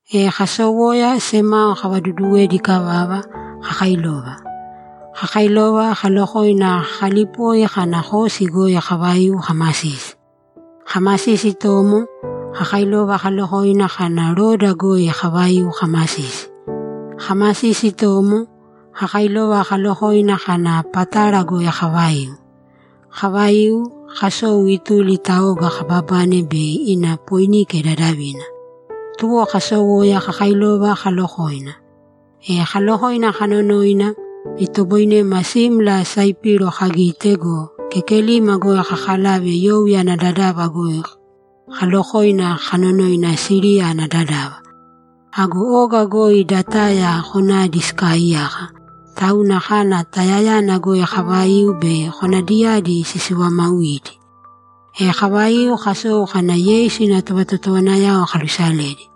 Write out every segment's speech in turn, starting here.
E kasowoya, semao kavaduduwedi ikavava, kakailova. Kakailova, kalokoina kakalipoi kana Kosi goi kavaiu kamasisi. Kamasisi itomo, kakailova kalokoina kana Rodo goi kavaiu kamasisi. Kamasisi itomo, kakailova kalokoina kana Pátara goi kavaiu. Kavaiu, kasou ituli ta oga kababane bei ina Poinike dadavina. Tuwo kasowoya kakailova kalokoina. E kaalokoina kanonoina, itoboinema simla Saipiro kagite go, kekelima goi kakalave youya ana dadava goi kalokoina kanonoina Siriya ana dadava. Ago oga goi da Taya konadi sikaaiyaka, tauna kana Tayayana goi kavaiu bei konadiyadi sisivamauidi. E kavaiu kasou kana Yeisu ina tovatotowanayao kalusaledi.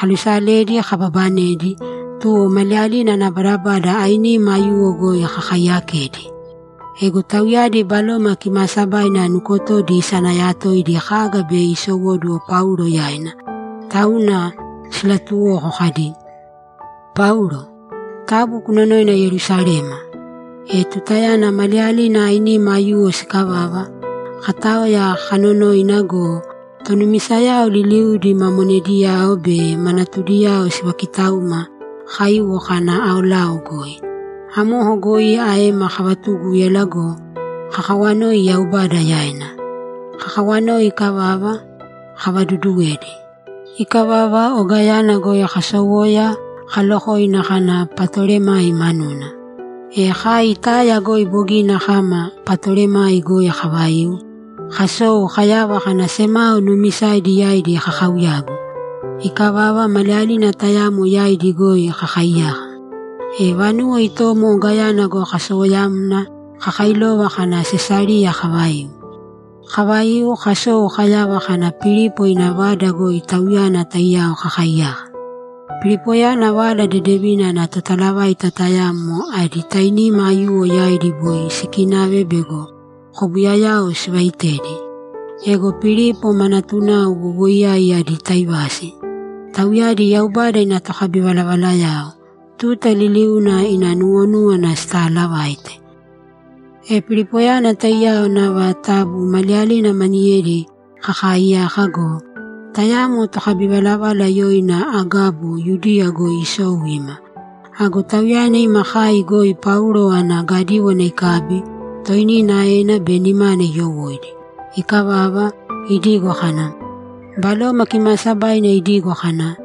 Kalusaledi, kababanedi, tuwo maliyalina ana badabada ainima aiyuwo goi kakaiyakedi. Ego tauyadi Baloma Kimaasabaina nukotodi isanayatoidi kaga bei isowóduwo Paulo yaina, tauna silaatuwoko kadi, ‘Paulo, taabu kunonōina Yerusalema.’ E tutayana maliyalina ainima aiyuwo sikavava, kataoya kanonoina go, tonumisayao liliudi ma monediyao be ma natudiyao sivakitauma kaiwo kana aolao goi. Amoko goi aema kavatugúyala go, kakawanoi Yaubada yaina. Kakawanoi ikavava, kavaduduwedi. Ikavava ogayana goi kasowoya kalokoina kana Patolemai manuna. E kai Taya goi bogina kama Patolemai goi kavaiu, kasou kayava kana semao nuumisaidi yaidi kakauyagu. Ikavava, maliyalina tayamo yaidi goi kakaiyaka. E vanuwo itomo ogayana goi kasowoyamna kakailova kana Sesariya kavaiu. Kavaiu, kasou kayava kana Pilipo ina vada goi tauyana taiyao kakaiyaka. Pilipoyana Vala Dedevina ana totalavaita tayamo adi tainima aiyuwo yaidi boi sikinave bego kobuyayao sivaitedi. Ego Pilipo ma natunao wowoiyai adi taivasi. Tauyadi Yaubada ina tokabivalavalayao; tuta liliuna ina nuwonúwana sitaalavaite. E Pilipoyana taiyao nava tabu maliyalina maniyedi kakaiyaka go, tayamo tokabivalavala yoina Agabo Yudiya goi isou ima. Ago tauyana ima kai goi Paulo ana gadíwana ikabi, toinina aena be nimana iyowóidi. Ikavava, idigo kana, ‘Baloma Kimaasabaina idigo kana,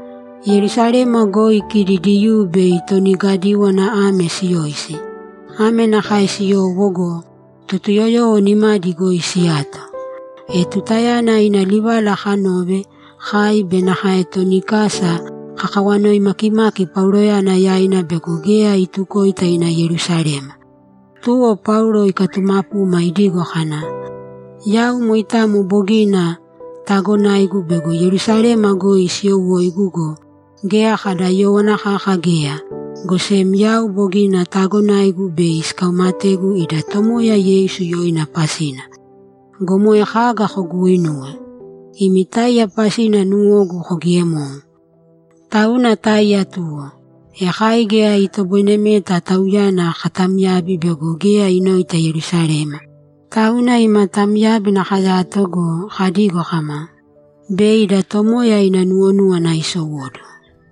“Yerusalema goi kidi Diyuu bei toni gadíwana ame siyoisi, ame nakae siyowo go, Totuyoyowo nimadi goi siyato.”’ E tutayana ina livala kanove, kai be nakae toni kasa kakawanoi makimaki Pauloyana yaina bego geya itukoita ina Yerusalema. Tuwo Paulo ikatumapuma idigo kana, ‘Yau moitamo bogina taagonaigu bego Yerusalema goi siyowóigu go, geya kada yówana kaka geya, go sem yau bogina taagonaigu bei sikaumategu ida Tomoya Yeisu yoina pasina! Go moe kaga koguuinuwe? Imi táiya pasina nuwogu kogiemou. Tauna táiya tuwo.’ E kai geya itoboinemeta tauyana katamyabi bego geya inoita Yerusalema, tauna ima tamyábina kayato go, kadigo kama, ‘Bei ida Tomoya ina nuwonúwana isowóduwo.’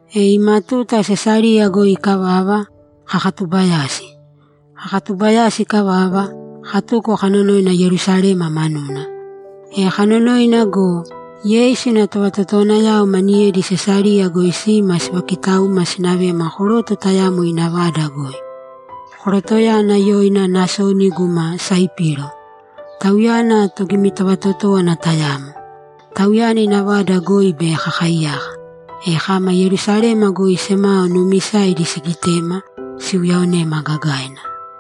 E ima tuta Sesariya goi ikavava, kakatubayasi. Kakatubayasi ikavava, katuko kanonoina Yerusalema manuna. E kanonoina go, Yeisu ina tovatotowanayao maniyedi Sesariya goi sima sivakitauma sinavema koroto tayamo ina vada goi. Korotoyana yoina Nasoni guma Saipiro. Tauyana togimivatotówana tayamo. Tauyana ina vada goi bei kakaiyaka. E kama Yerusalema goi semao nuumisaidi sigitema, siuyaonema gagaina.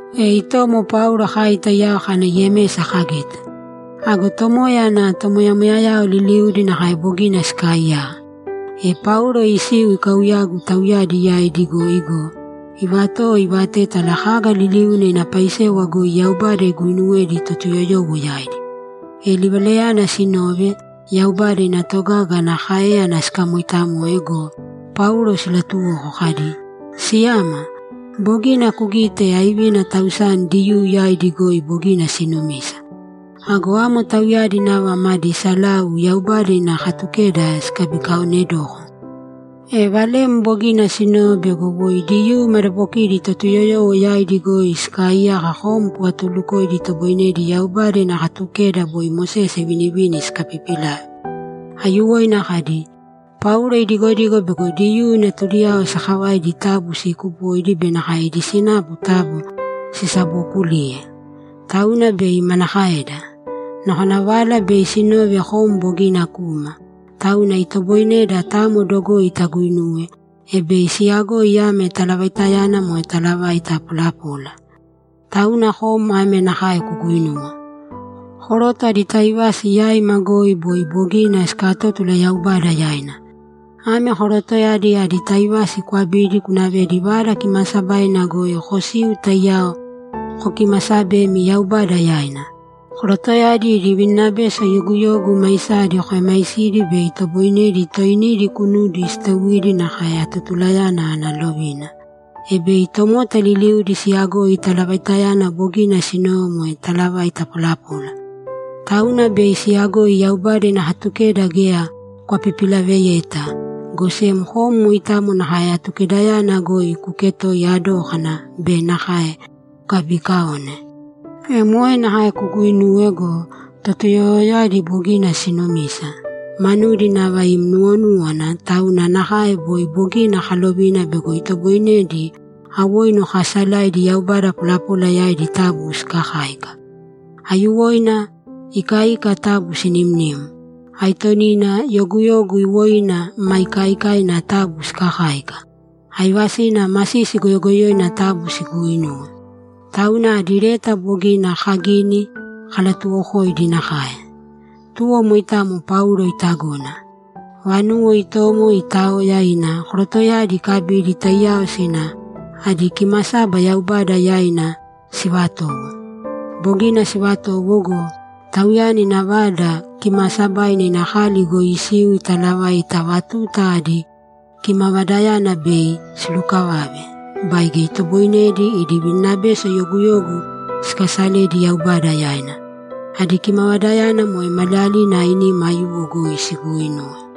E itomo Paulo kai taiyao kana Yemesa kagite. Ago Tomoya ana tomoyamoyayao liliudi nakae bogina sikaaiyaka. E Paulo isiu ikauyagu tauyadi yaidi goi go, ivatowo ivatétala kaga liliuna ina paisewa goi Yaubada iguinuwedi Totuyoyowo yaidi. E livalayana sinove, Yaubada ina togaga ana káeyana sikamoitamoe go, Paulo silatuwoko kadi, ‘Siyama, bogina kugite aivina tausani Diyuu yaidi goi bogina sinumisa. Ago amo tauyadi nava madi salau Yaubada ina Katukeda sikabikaaonedoko. E valem bogina sinove bego woi Diyuu madabokidi Totuyoyowo yaidi goi sikaaiyaka kom kuvatulukoidi itoboinedi Yaubada ina Katukeda boi Mosese ivinivini sikapipilave. Aiyuwoina kadi, “Paulo idigodigo bego Diyuu natudiyao sakavaidi taabu siikupōidi be nakae ida sinapu taabu sisabookulīye.” Tauna bei manakaeda? Nakona vala bei sinove kom bogina kuma, tauna itoboineda tamo dogoi taguinuwe, e bei siyagoi ame talavaitayana moe talavaita polapola. Tauna kom ame nakae kuguinūwe: Koroto adi taivasi yaima goi boi bogina sikatótula Yaubada yaina. Ame korotoyadi adi taivasi kwabīdi kunavēdi Vada Kimaasabaina goi kosīu taiyao kokimasabēmi Yaubada yaina. Korotoyadi idi vininabeso yoguyogu maisadi kuemaisīdi bei itoboinedi toinidi kunudi siteuidi nakae atotulayana ana lovina, e bei tomota liliudi siyagoi talavaitayana bogina sinove moe talavaita polapola. Tauna bei siyagoi Yaubada ina Katukeda geya kwapipilaveyeta, go sem kom moitamo nakae Atukedayana goi kuketooiya dókana be nakae kukabiikaone. E moe nakae kuguinūwe go, Totuyoyowoyadi bogina sinumisa, manudi nava ima nuwonúwana tauna nakae boi bogina kalovina bego itoboinedi awoinu kaasalaidi yaubada polapola yaidi taabu sikakāika. Aiyuwoina ikaika taabu sinimnīm. Aitonina yoguyogu iwoina ma ikaikaina taabu sikakāika. Aivasina masisi goyogoyoina taabu siguuinūwe. Tauna adi leta bogina kagini, kalatuwokoidi nakae.’ Tuwo moitamo Paulo itagona. Vanuwo itomo itaoya, ina korotoyadi ikabidi taiyao sina adi kimasaba Yaubada yaina sivatowo. Bogina sivatowo go, tauyana ina Vada Kimaasabaina ina kali goi isiu italavaita ava tuta adi kimavadayana bei silukavave baige itoboinedi idi vininabeso yoguyogu sikasaledi Yaubada yaina. Adi kimavadayana moe maliyalina ainima aiyuwo goi siguuinuwe.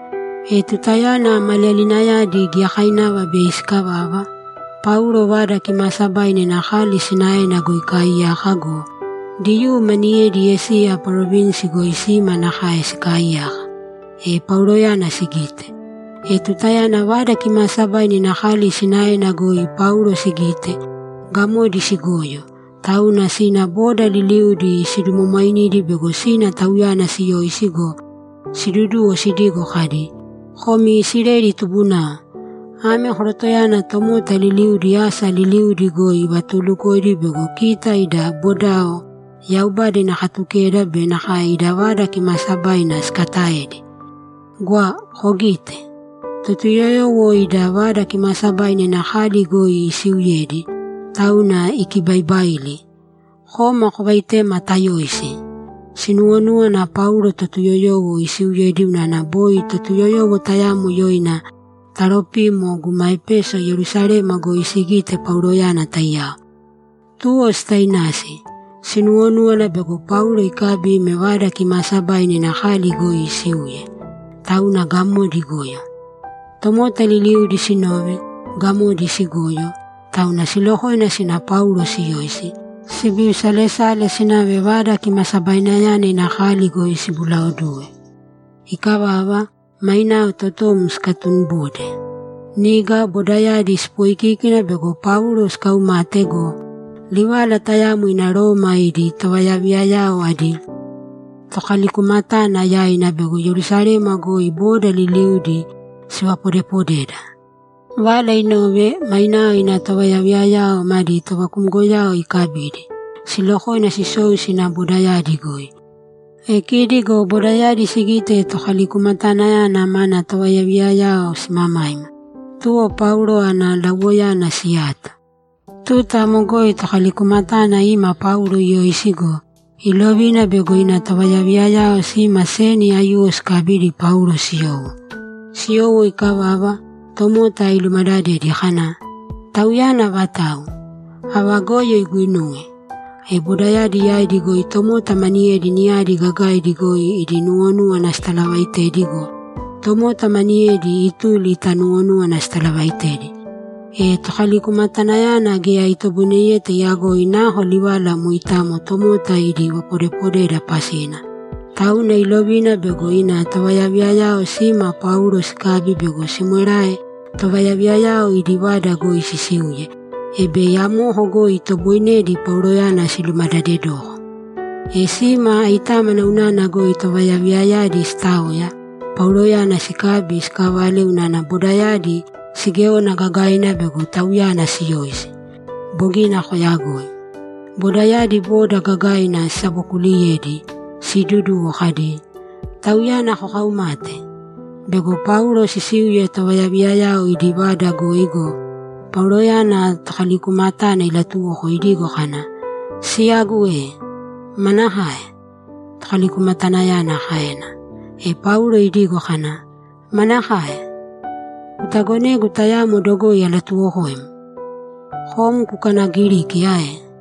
E tutayana maliyalinayadi giyakainava bei sikavava, Paulo Vada Kimaasabaina ina kali sinaena goi ikaaiyaka go, Diyuu maniyedi Esiya parovinsi goi sima nakae sikaaiyaka, e Pauloyana sigite. E tutayana Vada Kimaasabaina ina kali sinaena goi Paulo sigite, gamodi sigoyo, tauna sina boda liliudi sidumwamwainidi bego sina tauyana siyoisi go, siduduwo sidigo kadi, ‘Komi Isileli tubunao, ame korotoyana tomota liliudi asa liliudi goi ivatulukoidi bego kita ida bodao, Yaubada ina Katukeda be nakae ida Vada Kimaasabaina sikataedi! Gwa kogīte! Totuyoyowo ida Vada Kimaasabaina ina kali goi isiuyedi, tauna ikibaibaili! Kōma kovaitēma tayoisi!’ Sinuwonúwana Paulo Totuyoyowo isiuyedi unana boi Totuyoyowo tayamo yoina Taropimo guma Epeso Yerusalema goi sigite Pauloyana taiyao. Tuwo sitainasi; sinuwonúwana bego Paulo ikabi ime Vada Kimaasabaina ina kali goi isiuye. Tauna gamodi igoyo. Tomota liliudi sinove, gamodi sigoyo, tauna silokoina sina Paulo siyoisi, sibiusalesale sinave Vada Kimasabainayana ina kali goi sibulaoduwe. Ikavava, mainao totom sikatunibode. Niga bodayadi sipooikiki bego Paulo sikaumate go, livala tayamo ina Roma idi tovayaviyayao adi tokalikumatana yaina bego Yerusalema goi boda liliudi sivapodepodeda. Vala inove, mainao ina tovayaviyayao madi tovakumgoyao ikabidi, silokoina sisou sina bodayadi goi. E kidi go bodayadi sigite tokalikumatanayana mana tovayaviyayao simamaima, tuwo Paulo ana lauwoyana siyato. Tuta amo goi tokalikumatana ima Paulo iyoisi go, ilovina bego ina tovayaviyayao sima seni aiyuwo sikabidi Paulo siyowo. Siyowo ikavava, tomota ilumadadedi kana, ‘Tauyana avatau? Ava goyo iguinuwe?’ E bodayadi yaidi goi tomota maniyedi niyadi gagaidi goi idi nuwonúwana sitalavaitedi go, tomota maniyedi ituli ta nuwonúwana sitalavaitedi. E tokalikumatanayana geya itoboineyeta iyagoi nako livala moitamo tomota idi vapodepodeda pasina, tauna ilovina bego ina tovayaviyayao sima Paulo sikabi bego simwerae tovayaviyayao idi vada goi sisiuye, e bei amoko goi itoboinedi Pauloyana silumadadedoko. E sime aitámana unana goi tovayaviyayadi sitaoya, Pauloyana sikabi sikavale unana bodayadi sigéona gagaina bego tauyana siyoisi. Bogina koyagoi. Bodayadi boda gagaina sisabokuuliyedi, siiduduwo kadi, ‘Tauyana kokaumate!’ Bego Paulo sisiuye tovayaviyayao idi vada goi go, Pauloyana tokalikumatana ilatuwoko idigo kana, ‘Siyagu e!’ ‘Manakae?’ Tokalikumatanayana kaena. E Paulo idigo kana, ‘Manakae? Kutagonegu tayamo dogoi alatuwokoim?’ ‘Kom kukanagiriki ae?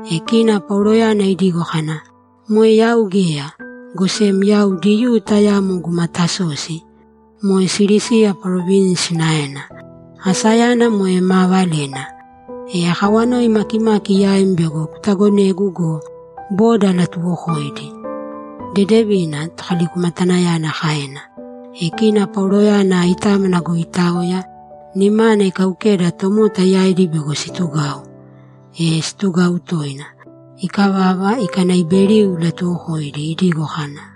E kina Pauloyana idigo kana, ‘Moe yau geya, go sem yau Diyuu tayamo guma Tasosi; moe Silisiya parovinsi sinaena. Asayana moe maa valena. E akawanoi makimaki yaim bego kutagonegu go, boda alatuwokoidi.’ ‘Dedevina’, tokalikumatanayana kaena. E kina Pauloyana aitámana goi itaoya, nimana ikaukeda tomota yaidi bego situgau. E situgau toina. Ikavava, ikanaiberiu ilatuwokoidi idigo kana,